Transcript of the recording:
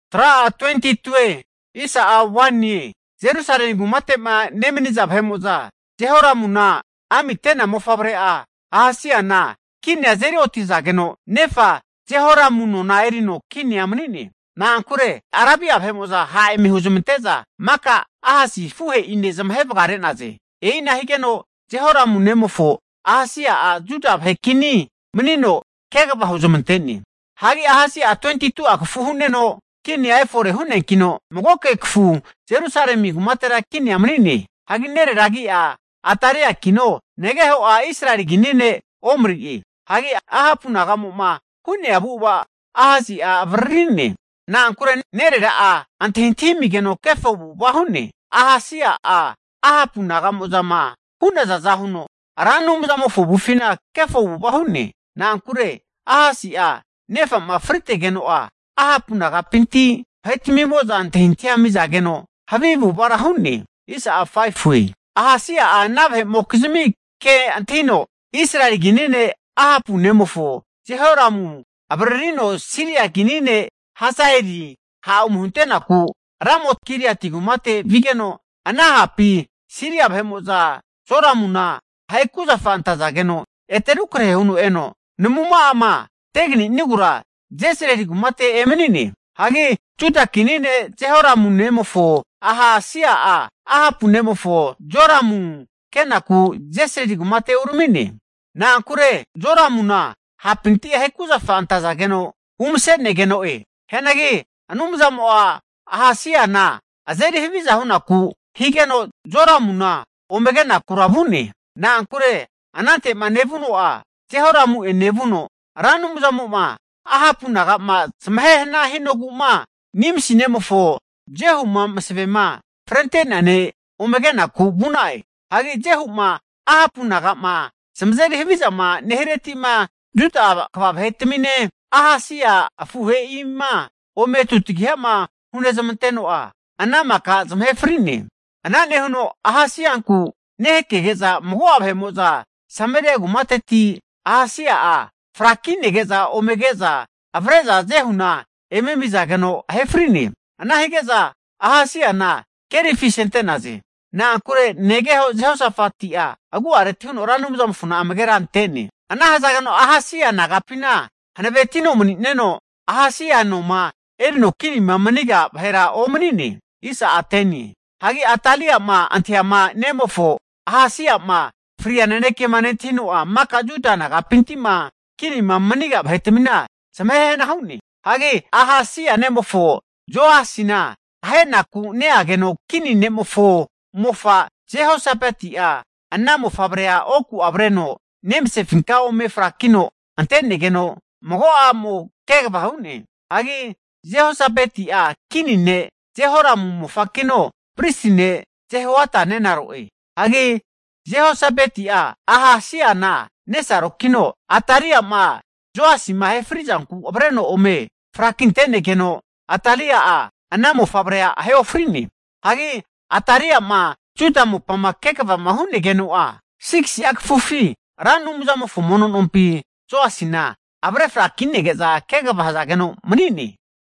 Hanki Jerusalemi kumate'ma nemani'za vahe'mo'za Jehoramuna amite'na mofavre'a Ahasiana kinia azeri otizageno, nefa Jehoramu nona erino kinia mani'ne. Na'ankure Arabia vahe'mo'za ha'ma eme huzmante'za maka Ahasi afuhe'ina zamahe vagare'naze. E'ina higeno Jehoramu nemofo Ahasi'a Juda vahe kini manino kegava huzmante'ne. Hagi Ahasia'a 22tu'a kafu hu'neno kinia efore hu'neankino, magoke kafu Jerusalemi kumatera kinia mani'ne. Hagi nerera agi'a Ataliakino negeho'a Israeli kini ne' Omri'e. Hagi Ahapu nagamo'ma hu'naza avu'ava Ahasia'a avariri'ne. Na'ankure nerera'a antahintahi amigeno kefo avu'ava hu'ne. Ahasia'a Ahapu naga'mo'zama hu'nazaza huno Ra Anumzamofo avufina kefo avu'ava hu'ne. Na'ankure Ahasia'a nefa'ma fritegeno'a Ahapu nagapinti vahetmimo'za antahintahia ami'zageno havi avu'avara hu'ne. Ahasia'a ana vahe'mokizmi ke antahino Israeli kini ne' Ahapu nemofo Jehoramu avaririno Siria vahe kini ne' Hazaeli ha' ome hunte'naku Ramot-Gileati kumate vigeno, ana hapi Siria vahe'mo'za Joramuna ahe kuzafa antazageno, ete rukrahe huno eno namuma'ama teganinogura Jezrili kumate emani'ne. Hagi Juda kini ne' Jehoramu nemofo Ahasia'a Ahapu nemofo Joramu kenaku Jezrili kumate urami'ne. Na'ankure Joramuna hapinti ahe kuzafa antazageno umase'negeno'e. Hianagi Anumzamo'a Ahasiana azeri haviza hunaku higeno, Joramuna ome kenakura vu'ne. Na'ankure anante'ma nevuno'a Jehoramu'ene vuno Ra Anumzamo'ma Ahapu nagama zamahe hana hinogu'ma Nimsi nemofo Jehu'ma masavema frente'nea ne' ome ke'naku vu'na'e. Hagi Jehu'ma Ahapu naga'ma zamazeri havizama nehireti'ma Juda kva vahetamine, Ahasia afuhe'ima ome tutagiha'ma hunezmanteno'a, ana maka zamahe fri'ne. Ana nehuno Ahasianku nehakege'za, mago'a vahe'mo'za Sameria kumateti Ahasia'a frakinege'za ome ke'za avre'za Jehuna eme amizageno, ahe fri'ne. Ana hige'za Ahasiana kerifi asente'naze. Na'ankure negeho Jehosafati'a agu'areti huno Ra Anumzamofona amagera ante'ne. Ana hazageno Ahasia nagapina hanavetino mani'neno Ahasia noma erino kinima maniga vahera omani'ne. Hagi Atalia'ama antahiama nemofo Ahasia'ma fria nanekema nentahino'a, maka Juda nagapinti'ma kinima maniga vahetamina zamahe hana hu'ne. Hagi Ahasia nemofo Joasina ahenaku neageno, kini ne'mofo mofa Jehosabeti'a ana mofavrea oku'a avreno nemasefinka ome frakino ante'negeno mago a'mo kegava hu'ne. Hagi Jehosabeti'a kini ne' Jehoramu mofakino pristi ne' Jehoaida nenaro'e. Hagi Jehosabeti'a Ahasiana nesarokino Atalia'ma Joasima ahe fri'zanku avreno ome frakinte'negeno Atali'a ana mofavrea ahe ofrine. Hagi Atalia'ma Juda mopama kegavama hu'negeno'a, 6si'a kafufi Ra Anumzamofo mono nompi Joasina avre frakine'za kegava hazageno mani'ne.